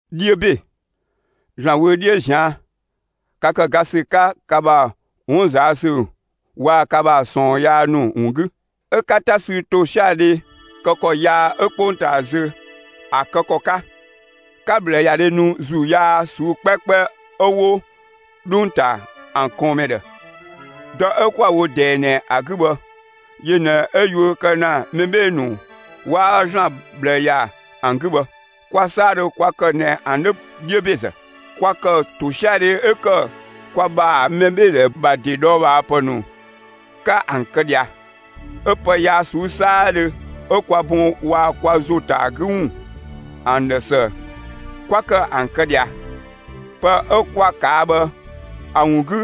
'Dhiö ‑be, ‑Zlan wö 'dhiö ꞊zian', ka ‑kë ga ‑sü 'ka ka ‑bha 'wun ꞊zaa' ‑sü waa‑ ka ‑bha ꞊sɔɔn yaa ‑nu ‑wun 'gü; 'ö 'ka 'ta sü ‑tosiadhe kë ‑kɔ yaa 'ö 'kpongtaa zö ‑a kë ‑kɔ 'ka; 'ka ꞊bhlëyadhe nu ‑zuu yaa ꞊suu'‑ 'kpɛkpɛ 'ö 'wo 'dhung‑ ‑ta ‑an ꞊kɔɔnmɛ ‑dhë. Dɔ 'ö 'kwa‑ wo ꞊dɛɛ ꞊nɛ ‑a 'gü bhë, yö ꞊nɛ 'ö yuö kë ‑na mɛ 'bhee‑ ‑nu 'waa ‑Zlan ꞊bhlë ‑ya ‑an 'gü bhë. Kwa 'saadhö kwa ‑kë ꞊nɛ ‑an 'dhö 'dhiö ‑bezë; kwa ‑kë ‑tosiadhe 'ö ‑kë kwa ‑bha mɛbheedhɛ ‑bha ‑de ꞊dhɔɔbhaapë ‑nu 'ka ‑an kë ꞊dhia; 'ö pë yaa ꞊suu'‑ 'saadhö 'ö kwa bun waa‑ kwa ‑zo ‑ta ‑a 'gü ‑wun ‑an ‑dhë ‑së, 'kwa ‑kë ‑an kë ꞊dhia. Pë 'ö 'kwa ꞊kaa' bhë ‑a ‑wun 'gü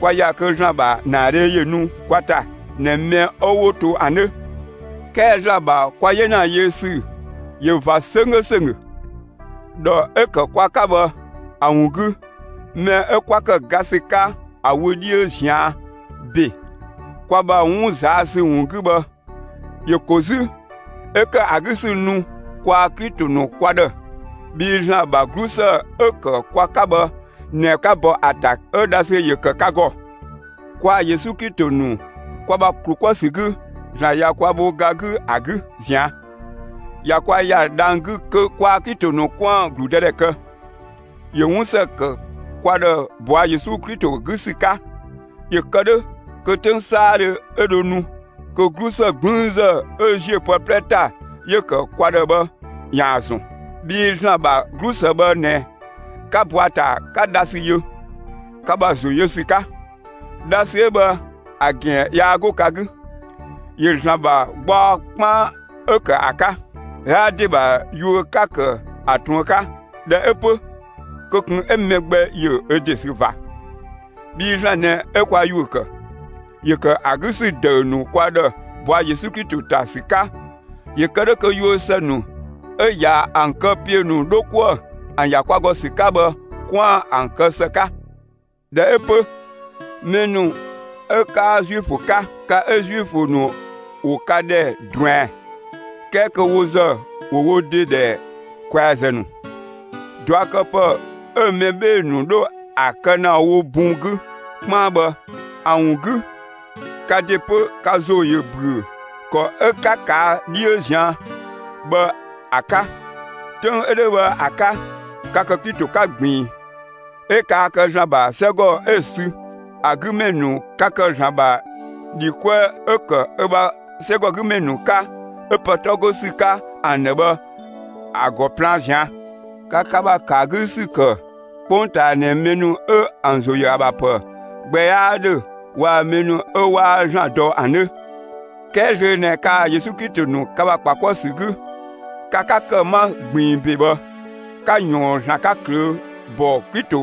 'kwa ‑ya kö ‑Zlan ‑bha ‑naadhe ‑yö nu kwa ‑ta ꞊nɛ mɛ ‑nu 'wo to ‑an 'dhö. 'Kɛɛ ‑Zlan ‑bha kwa 'yena yö ‑sü ꞊yö ꞊va 'sönggö ‑sönggö. ‑Dhɔ 'ö‑ ‑kë kwa 'ka bhë ‑a ‑wun 'gü, mɛ 'ö kwa ‑kë ga ‑sü 'ka ‑a wö 'dhiö ꞊zian' ‑be kwa ‑bha 'wun ꞊zaa' ‑sü ‑wun 'gü bhë, ‑yö ‑ko 'zü 'ö ‑kë ‑a 'gü ‑sü nu kwaa‑ Klito ‑nu kwa ‑dhë. Bhii ‑Zlan ‑bha 'glusë 'ö‑ ‑kë kwa 'ka bhë ꞊nɛ 'ka bɔ ‑a ‑ta 'ö dhasü ‑yö ‑kë ka ‑gɔ. Kwaa‑ Yesu Klito ‑nu kwa ‑bha ‑klu 'kuë‑ ‑sü 'gü, ‑Zlan ꞊ya kwa bho ga 'gü ‑a 'gü ꞊zian'. ꞊Ya kwa ‑ya dhang‑ 'gü kö kwaa‑ Klito ‑nu 'kwaan‑ ‑gludëdhɛ kë. ‑Yö 'wun ‑së ‑kë kwa ‑dhë ꞊bɔa' Yesu Klito 'gü ‑sü 'ka, ‑yö kë 'dhö kö 'töng 'saadhö 'ö dho nu, kö 'glusë 'gblüünzë 'ö ‑ziö pë 'plɛ ‑ta 'yö‑ ‑kë kwa ‑dhë bhë ‑yaan ‑zɔn. Bhii ‑Zlan ‑bha 'glusë bhë ꞊nɛ, 'ka bɔ ‑a ‑ta, 'ka dhasü yö, ka ‑bha ‑zo yö ‑sü 'ka. Dhasü 'ö bhë ‑a ‑gɛn yaa 'go ka 'gü. ‑Yö ‑Zlan ‑bha gbaɔ 'kpaan 'ö ‑kë ‑a 'ka. 'Yaa ‑de ‑bha yuö 'ka‑ ‑kë ‑a ꞊truën 'ka; ꞊dhɛ 'ö 'pö kö ꞊kun 'ö mɛ gbɛ ‑yö ö ‑de sü ꞊va! Bhii ‑Zlan ꞊nɛ 'ö kwa ‑yuö ‑kë; ‑yö ‑kë ‑a 'gü ‑sü ‑dëü ‑nu kwa ‑dhë ꞊bɔa' Yesu Klito ‑ta ‑sü 'ka ‑yö kë 'dhö kö yuö ‑së ‑nu 'ö ꞊ya ‑an kë ‑piö ‑nu 'dho 'kuë‑ ‑an ‑ya kwa ‑gɔ ‑sü 'ka bhë 'kwaan‑ ‑an kë ‑së 'ka. ꞊Dhɛ 'ö 'pö, mɛ ‑nu 'ö 'kaa Zuifö 'ka, ka 'ö Zuifö ‑nu ‑wo ka ‑dhɛ ꞊druɛn, 'kɛɛ kö wo ‑zë ‑wo wo ‑de ‑dhɛ ‑kwɛazë ‑nu, ꞊duakëpë 'ö mɛ 'bhee‑ ‑nu 'dho ‑a kë ‑na wo bun 'gü 'kpaan bhë ‑a ‑wun 'gü, ka ‑de 'pö ka ‑zo ‑yö ‑büö ‑kɔ 'ö 'ka ꞊kaa' 'dhiö ꞊zian' bhë ‑a 'ka. 'Töng 'ö 'dhö bhë ‑a 'ka, ka ‑kë Klito 'ka ꞊gbiin, 'ö kaa kë ‑Zlan ‑bha 'sɛgɔ 'ö‑ sü ‑a 'gü ‑mɛ ‑nu 'ka; ka ‑kë ‑Zlan ‑bha ‑dhi 'kuë 'ö‑ ‑kë ö ‑bha 'sɛgɔgümɛ ‑nu 'ka 'ö pë 'tɔ 'go ‑sü 'ka ‑an ‑dhë bhë ‑a ‑gɔ plaan ꞊zian'; ka ka ‑bha ‑kë ‑a 'gü ‑sü ‑kë 'kpongtaa ꞊nɛ mɛ ‑nu 'ö ‑an ‑zo ‑yö ‑a ‑bha ‑pë gbɛ 'yaa 'dhö waa‑ mɛ ‑nu 'ö 'waa ‑Zlan dɔ ‑an 'dhö. 'Kɛɛ zlöö ꞊nɛ kaa‑ Yesu Klito ‑nu ka ‑bha ‑kpa 'kuë‑ ‑sü 'gü, ka 'ka ‑kë 'ma ꞊gbiin ‑be bhë, 'ka ꞊yɔɔn ‑Zlan 'ka ꞊klöö' ‑bɔ Klito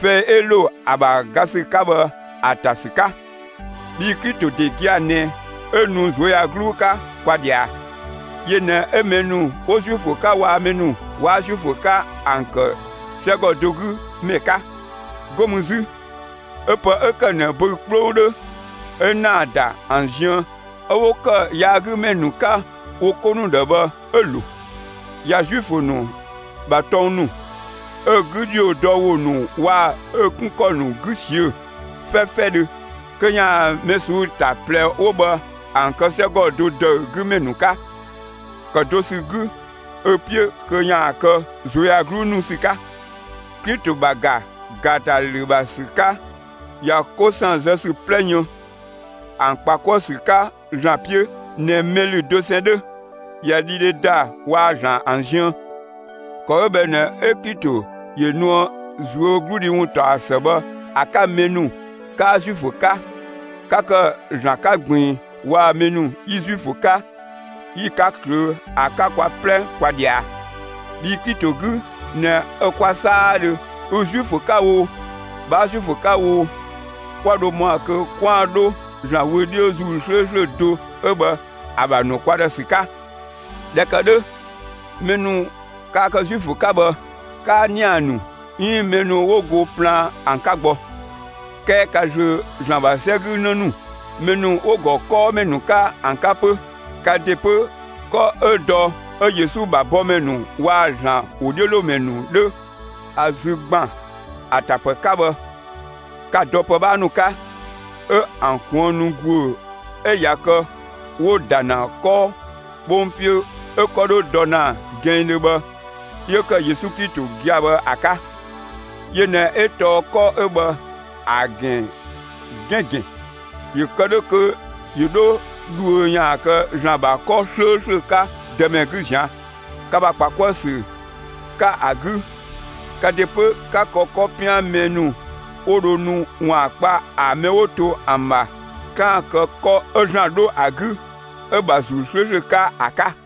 fɛi 'ö ‑lo ‑a ‑bha ga ‑sü 'ka bhë ‑a ‑ta ‑sü 'ka. Bhii Klito ‑de gia‑ ꞊nɛ 'ö nu ꞊zuöyagluu 'ka kwa ꞊dhia; yö ꞊nɛ 'ö mɛ ‑nu 'wo Zuifö 'ka waa‑ mɛ ‑nu 'waa Zuifö 'ka ‑an ‑kë 'sɛgɔ do 'gü ‑mɛ 'ka. 'Go mü 'zü, 'ö pë 'ö ‑kë ꞊nɛ böü‑ 'kplong 'dhö 'ö‑ ‑naa ‑da ‑an ziën 'ö 'wo ‑kë yaagümɛ 'ka wo 'ko ‑nu ‑dhë bhë 'ö‑ ‑lo. ꞊Ya Zuifö ‑nu ‑bha tɔng ‑nu, ö 'gü ‑dhiodɔwo ‑nu waa‑ ö 'kun ‑kɔ ‑nu 'gü ꞊siö'‑ 'fɛfɛdhö kö ‑yaan mɛ ꞊suu'‑ ‑ta ꞊plɛ 'wo bhë ‑an kë 'sɛgɔ do ‑dëü 'gü ‑mɛ ‑nu 'ka ‑kë do ‑sü 'gü ö 'piö kö ‑yaan kë ꞊zuöyagluu nu ‑sü 'ka. Klito ‑bha ‑ga ‑gaatalü ‑bha ‑sü 'ka ꞊ya 'ko ‑san zë ‑sü 'plɛ yën, ‑an ‑kpa 'kuë‑ ‑sü 'ka ‑Zlan 'piö ꞊nɛ mɛ ‑lü dosɛn 'dhö. ꞊Ya dhidhe ‑da waa‑ ‑Zlan ‑an ziën. ‑Kɔ 'ö bhë ꞊nɛ 'ö Klito ‑yö nuë ꞊zuögludhi ‑wuntaɔsë bhë ‑a 'ka mɛ ‑nu 'kaa Zuifö 'ka, 'ka kë ‑Zlan 'ka ꞊gbiin waa‑ mɛ ‑nu 'yi Zuifö 'ka 'yi‑ 'ka ꞊klöö', ‑a 'ka kwa 'plɛ kwa ꞊dhia. Bhii Klito 'gü ꞊nɛ 'ö kwa 'saadhö, ü Zuifö 'ka oo, 'bhaa Zuifö 'ka oo, 'kwa dho ‑mɔa kö 'kwaan‑ 'dho ‑Zlan wö 'dhiö ‑Zuu 'slööslö do 'ö bhë ‑a ‑bha ‑nu kwa ‑dhë ‑sü 'ka. ꞊Dhɛ ‑kë 'dhö, mɛ ‑nu kaa kë Zuifö 'ka bhë, 'kaa ‑nia ‑nu 'iin mɛ ‑nu 'wo go plaan ‑an 'ka gbɔ. 'Kɛɛ ka zlöö ‑Zlan ‑bha 'sɛ 'gü 'në ‑nu, mɛ ‑nu 'wo‑ ‑gɔ 'kɔɔmɛ ‑nu 'ka ‑an 'ka 'pö. Ka ‑de 'pö, 'kɔ 'ö dɔ 'ö Yesu ‑bha bɔmɛ ‑nu waa‑ ‑Zlan ‑wodhiölomɛ ‑nu 'dhö ‑a 'zü ‑gban ‑a tapë 'ka bhë, ka‑ dɔ ‑pë 'bhaa ‑nu 'ka; 'ö ‑an kuënnu ‑guö 'ö ꞊ya kë 'wo‑ ‑da ‑na 'kɔ 'bhong 'piö 'ö 'kɔ 'dho dɔ ‑na gɛnngdhö bhë 'yö ‑kë Yesu Klito gia‑ bhë ‑a 'ka. Yö ꞊nɛ 'ö tɔɔ 'kɔ 'ö bhë ‑a ‑gɛn 'gɛn‑ ‑gɛn; ‑yö kë 'dhö kö ‑yö 'dho dhuö ‑yaan kë ‑Zlan ‑bha 'kɔ 'slööslö 'ka Dëmɛ 'gü ꞊zian'. Ka ‑bha ‑kpa 'kuë‑ ‑sü 'ka ‑a 'gü, ka ‑de 'pö 'ka kë 'kɔ 'pian mɛ ‑nu 'wo dho nu ‑waan kpa ‑a mɛ 'wo to ‑an ‑bha 'kaan‑ kë 'kɔ 'ö ‑Zlan 'dho ‑a 'gü ö ‑bha ‑Zuu 'slööslö 'ka ‑a 'ka.